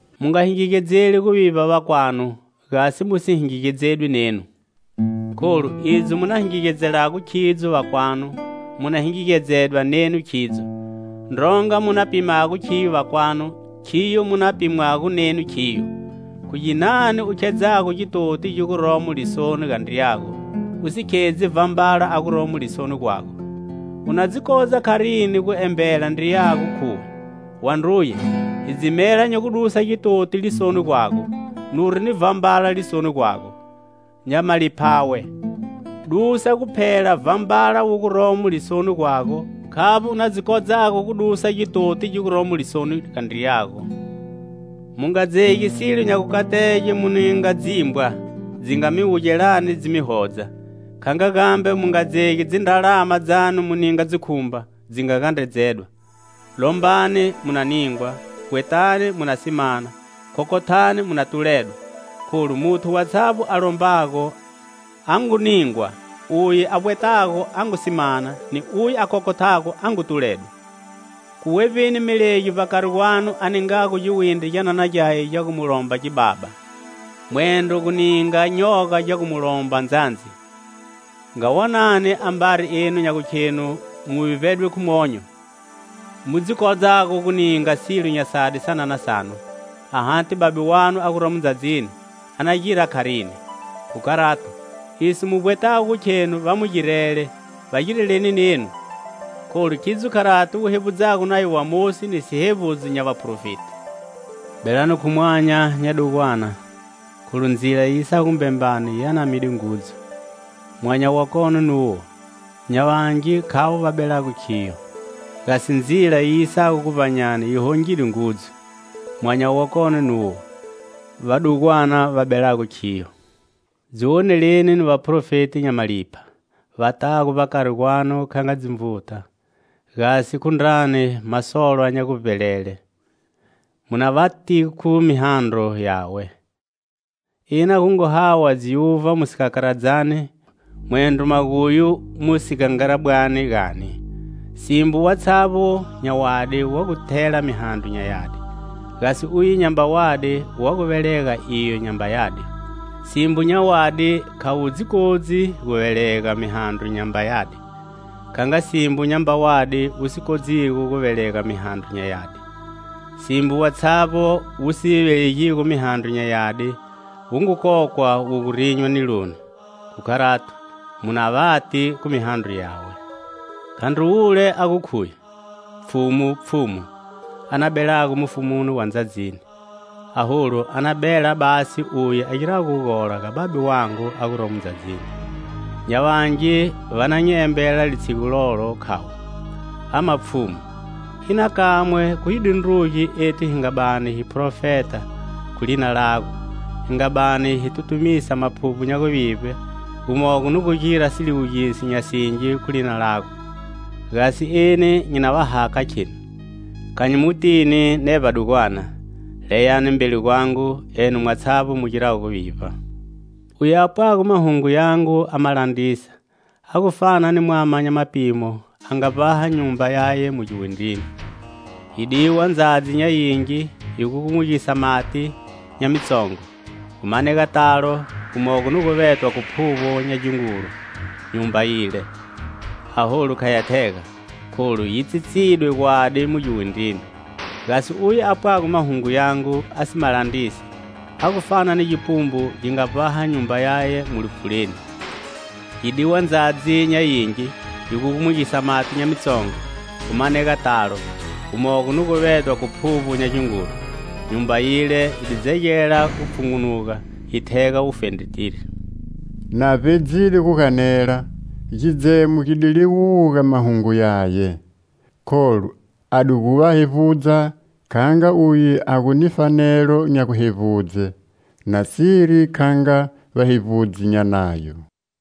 "Mu nga hingegedzeli guvivba vakwanu, gasi mu si hingegedzedwi nenu. Kholu, idzo mu na hingegedzelago khidzo vakwanu, mu na hingegedzedwa nenu khidzo. Ndronga mu na pimago khiyo vakwanu, khiyo mu na pimwago nenu khiyo. Khu ginani u khedzago gitoti gi guromo lisoni ga ndriyago, u si khedzi vhambala a guromo lisoni gwago? U na dzi kodza kharini gu embela ndriyago, khuwe: 'Wandruye, hidzimela nyi gu dusa gitoti lisoni gwago,' nuri ni vhambala lisoni gwago? Nya maliphawe! Dusa guphela vhambala wu guromo lisoni gwago, khavbo u na dzi kodzago gu dusa gitoti gi guromo lisoni ga ndriyago. "Mu nga dzegi silo nya gukatege mu ninga dzimbwa, dzinga mi wugelani dzi mi hodza; kha nga gambe, mu nga dzegi dzindralama dzanu mu ninga dzikhumba, dzi nga gandredzedwa. "Lombani, mu na ningwa; vbwetani, mu na si mana; khokhothani, mu na tuledwa. Kholu muthu watshavbo a lombago a ngu ningwa; uye a vbwetago a ngu si mana, ni uye a khokhothago a ngu tuledwa. Khu wevbi melegi, vbakari gwanu, a ningago giwindri gyanana gyaye gya gu mu lomba gibaba? Mwendro gu gi ninga nyoga gya gu mu lomba ndzandzi? Nga wonani: ambari enu nya gukhenu mu vivbedwe khu monyo mu dzi kodzago gu ninga silo nya sadi sanana sanu, ahati Babe wanu a guromo ndzadzini a na gira kharini? Khu kharato, iso mu vbwetago gu khenu va mi girele, va gireleni nenu, kholu khidzo kharati wu hevbudzago Nayo wa Mosi ni sihevbudzo nya vaphrofeti. "Belani khu mwanya nya dugwana! Kholu ndzila yi yisago gumbembani yi anamide ngudzu; mwanya wakone nuwo. Nya vangi khavo va belago khiyo! Gasi ndzila yi yisago guvbanyani yi hongide ngudzu; mwanya wakone nuwo. Vadugwana va belago khiyo. "Dzi woneleni ni vaphrofeti nya malipha, va tago vbakari gwanu kha nga dzinvuta, gasi khu ndrani masolwa nya guvbelele. Mu na va ti khu mihandro yawe. Ina gu ngu hawa dziuvha mu sikakaradzani, mwendro maguyu mu sigangarabwani, gani? Simbo watshavbo nya wadi wa gu thela mihandro nya yadi; gasi uye nyamba wadi wa gu velega iyo nyamba yadi. Simbo nya wadi kha wu dzi kodzi gu velega mihandro nyamba yadi. Kha nga simbo nyamba wadi wu si dzi kodzigo gu velega mihandro nya yadi. Simbo watshavbo wu si velegigo mihandro nya yadi wu ngu kokwa wu gu rinywa niloni. Khu kharato, mu na vati khu mihandro yawe." "Khandri wule a gu khuye: 'Pfhumu, Pfhumu,' a na belago mufumuni wa ndzadzini. Aholu a na bela basi uye a girago gugola ga Babe wangu a guromo ndzadzini. Nya vangi va na nyi embela litshigu lolo, khavo: 'Ama Pfhumu, ina kamwe khu hi dundrugi ethu hi nga bani hi phrofeta khu lina lago, hi nga bani hi tutumisa maphuvbo nya guvivbe, gumogo ni gu gira siliwugiso nya singi khu lina lago?' Gasi eni nyi na va hakha, kheni: kha nyi mu tini ne vbadugwana. Leyani mbeli gwangu, enu mwatshavbo mu girago guvivba. "Uye a pwago mahungo yangu a ma landrisa, a gu fana ni mwama nya mapimo a nga vbaha nyumba yaye mu giwindrini. Yi diwa ndzadzi nya yingi, yi gugumugisa mati nya mitsongo, gu manega talo; gumogo ni gu vetwa khu phuvbo nya gingulu nyumba yile; aholu kha ya thega, kholu yi tsitsidwe gwadi mu giwindrini. Gasi uye a pwago mahungu yangu a si ma landrisi, a gu fana ni gipumbu gi nga vbaha nyumba yaye mu lipfuleni. Yi di wa ndzadzi nya yingi, yi gugumugisa mati nya mitsongo, gu manega talo; gumogo ni gu vetwa khu phuvbo nya yikhongolo; nyumba yile yi di dzegela gu pfhungunuga yi thega wufendretiri." Na vbedzide gu ganela, gidzemo gi di liwuga mahungo yaye. Kholu a di gu va hevbudza kha nga uye a gu ni fanelo nya guhevbudze, nasiri kha nga vahevbudzi nya Nayo.